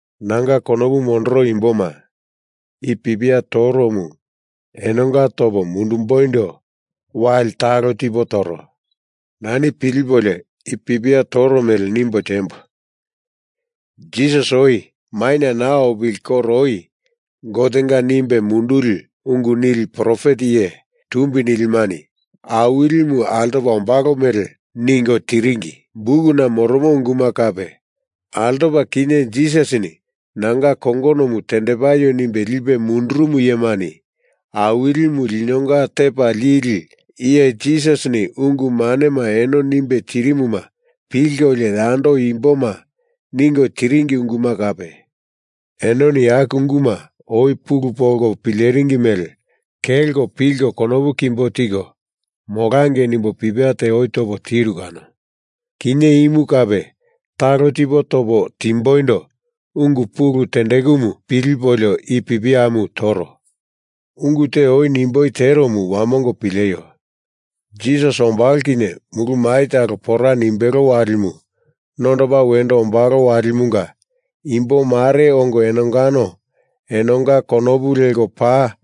Nanga konopu mondoro imboma, i pipia toromu enonga topo mundumboindo wali talo tipo toro. Nani pilipolio i pipia toro mele nimbo tiembo, Jisas oi maina naa opili koro oi Gotenga nimbe munduli ungu nili profet iye tumbi nilimani Awilimu altopa ombalo mele ningo tiringi bukuna moromo unguma kape, altopa kinye Jisasini nanga kongonomu tendepaio nimbe lipe mundurumu iyemani Awilimu linonga Tepa Lili Iye Jisasini ungu manema eno nimbe tirimuma pilkolio yando imboma ningo tiringi unguma kape, enoni aku unguma oi pulu polko pileringi mele kelko pilko konopu kimbo tiko molangei nimbo pipia te oi topo tiru kano. Kinye imu kape talo tipo topo timboindo ungu pulu tendekumu pilipolio i pipiamu toro. Ungu te oi nimboi teromu wamongo pileio, Jisas ombalo kinye mulu mai talo pora nimbelo walimu nondopa wendo ombalo walimanga imbo mare ongo enongano enonga konopu leko paa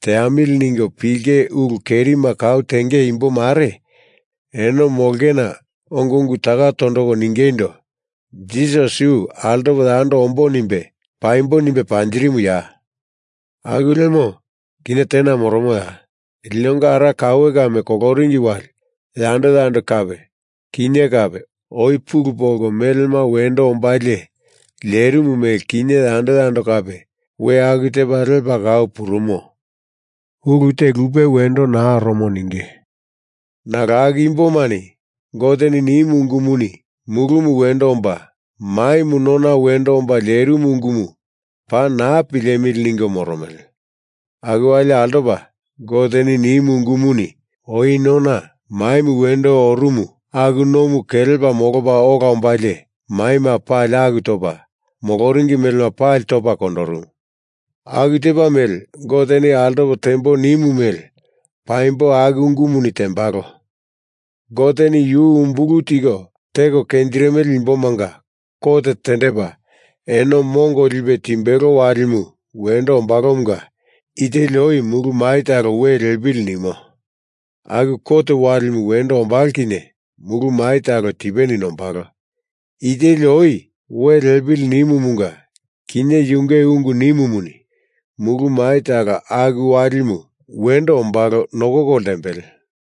teamili ningo pilinge ulu kerima kau tenge imbo mare eno molongena ongo ungu taka tondoko ningeindo: “Jisas yu altopo yando ombo nimbe, paimbo nimbe panjirimuya? Aku lemo, kinye tena moromoya? Linonga ara kaue kame koloringi wali, yando yando kape, kinye kape, oi pulu polko melema wendo ombalie lierimu mele kinye yando yando kape we aku tepa lepa kau purumo. Ulu te lupe wendo naa oromo,” ninge. Nalo aku imbomani Goteni nimu ungumuni mulumu wendo omba, maimu nona wendo omba lierimu ungumu paa naa pilemili ningo moromele. Aku wali altopa Goteni nimu ungumuni oi nona maimu wendo orumu aku nomu kelepa molopa ola ombalie maima pali aku topa, moloringi melema pali topa kondorumu. Aku tepa mele Goteni altopo tembo nimu mele paimbo aku ungumuni tembalo. Goteni yu umbulu tiko teko kenjirimele imbomanga kot tendepa eno mongo lipe timbelo walimu wendo ombalomunga i teli oi mulu mai talo we liepili nimo. Aku kot walimu wendo ombalo kinye mulu mai talo tipeni nombalo, i teli oi we liepili nimumunga kinye yunge ungu nimumuni mulu mai talo aku walimu wendo ombalo nokoko ltembele.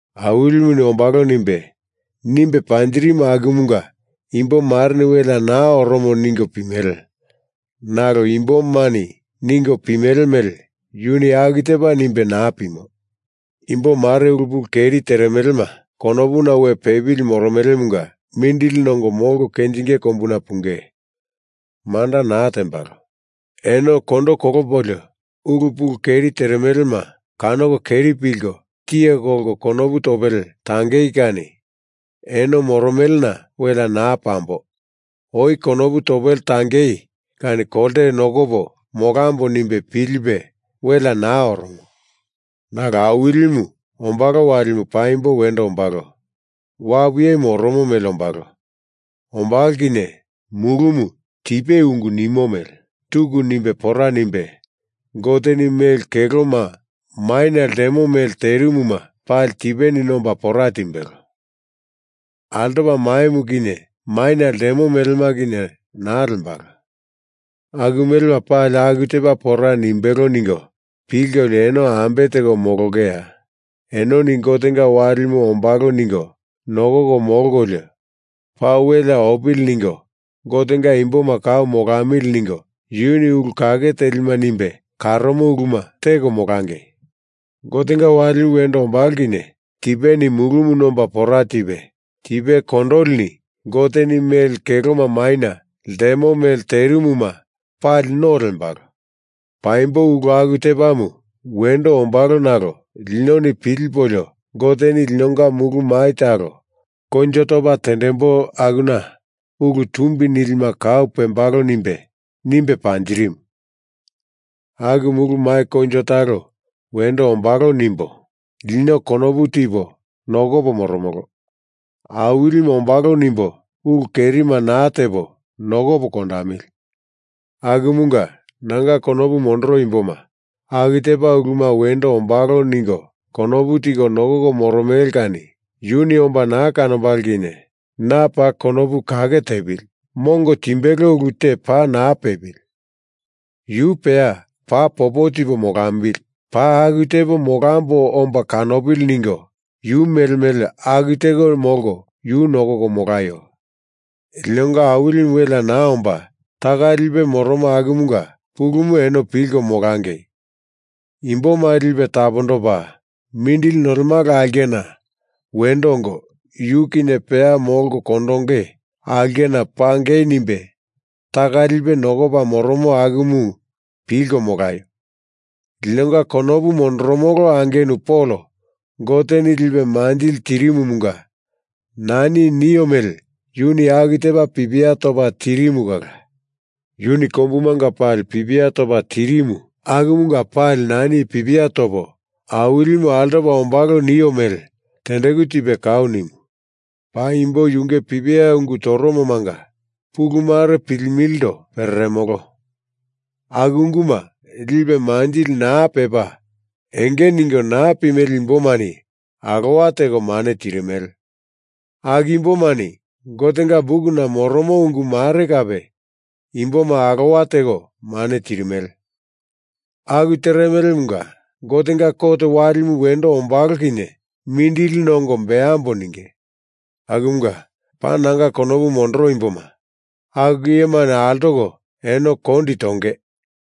Awilimuni ombalo nimbe, nimbe panjirimu akumunga imbo mareni welea naa oromo ningo pimele. Nalo imbomani ningo pimele mele yuni aku tepa nimbe naa pimo. Imbo mare ulu pulu keri teremelema konopuna we pepili moromelemunga mindili nongo molko kenjinge kombuna punge, manda naa tembalo. Eno kondo kolopolio, ulu pulu keri teremelema kanoko keri pilko tiye kolko konopu topele tangei kani eno moromelena welea naa pambo, oi konopu topele tangei kani kolte nokopo molambo nimbe pilipe welea naa oromo. Nalo Awilimu ombalo walimu paimbo wendo ombalo. Wapu iyemu oromo mele ombalo. Ombalo kinye mulumu tipe ungu nimo mele tuku nimbe pora nimbe, Goteni mele keloma maina ltemo mele terimuma pali tipeni nomba pora timbelo. Altopa maimu kinye maina ltemo melema kinye naa lembalo. Aku melema pali aku tepa pora nimbelo ningo pilkolio eno ambe teko molongeya? Enoni Gotenga walimu ombalo ningo nokoko molkolio paa welea opili ningo Gotenga imboma kau molamili ningo yuni ulu kake telima nimbe karomo uluma teko molangei. Gotenga walimu wendo ombalo kinye tipeni mulumu nomba pora tipe, tipe kondolini Goteni mele keloma maina ltemo mele terimuma pali no lembalo. Paimbo ulu aku tepamu wendo ombalo nalo linoni pilipolio Goteni linonga mulu mai talo koinjo topa tendembo, akuna ulu tumbi nilima kau pembalo nimbe, nimbe panjirimu. Aku mulu mai koinjo talo wendo ombalo nimbo lino konopu tipo nokopo moromolo. Awilimu ombalo nimbo ulu kerima naa tepo nokopo kondamili. Akumunga, nanga konopu mondoro imboma, aku tepa uluma wendo ombalo ningo konopu tiko nokoko moromele kani Yuni omba na kanombalo kinye, na paa konopu kake tepili, mongo timbelo ulu te paa naa pepili, yu peya paa popo tipo molambili, paa aku tepo molambo omba kanopili ningo yu mele mele aku teko molko yu nokoko molaio. Linonga Awilimu welea naa omba taka lipe moromo akumunga pulumu eno pilko molangei. Imboma lipe tapondopa, mindili nolemala aulkena wendo ongo, yu kinye peya molko kondonge aulkena pangei nimbe taka lipe nokopa moromo akumu pilko molaio. Linonga konopu mondoromolo angenu Pol Goteni lipe manjili tirimumunga nani i nio mele yuni aku tepa pipia topa tirimu kala. Yuni kombumanga pali pipia topa tirimu akumanga pali nani i pipia topo Awilimu altopa ombalo nio mele tendeku tipe kau nimu. Paimbo yunge pipiana ungu toromomanga pulu mare pilimilindo pereremolo, aku unguma lipe manjili naa pepa, enge ningo naa pimele imbomani alowa teko mane tirimele, aku imbomani Gotenga bukuna moromo ungu mare kape imboma alowa teko mane tirimele. Aku teremelemunga Gotenga kot walimu wendo ombalo kinye mindili nongo beambo ninge. Akumunga, paa nanga konopu mondoro imboma, aku iyemani altoko eno kondi tonge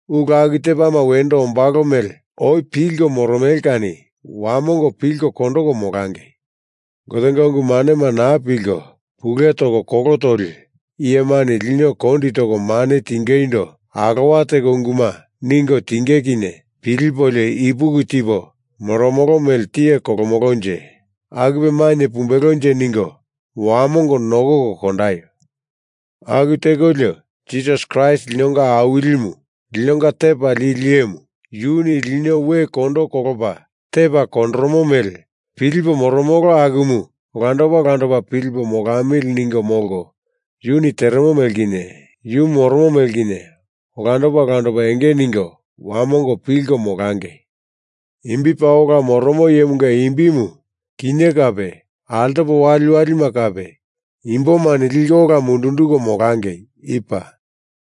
ulu aku tepama wendo ombalo mele oi pilko moromele kani wamongo pilko kondoko molangei. Gotenga ungu manema naa pilko, pule toko kolo toli iyemani lino kondi toko mane tingeindo alowa teko unguma ningo tinge kinye pilipolio ipuki tipo moromolo mele tiye kolomolonje, akupe mainye pumbelonje ningo wamongo nokoko kondaio. Aku tekolio, Jisas Kraist linonga Awilimu, linonga Tepa Lili Iyemu, Yuni lino we kondo kolopa tepa kondoromo mele pilipo moromolo akumu olandopa olandopa pilipo molamili ningo molko, Yuni teremo mele kinye Yu moromo mele kinye olandopa olandopa enge ningo wamongo pilko molangei. Imbi paa ola moromo iyemunga imbimu, kinye kape altopo waliwalima kape imbomani liko ola mundunduko molangei. I paa.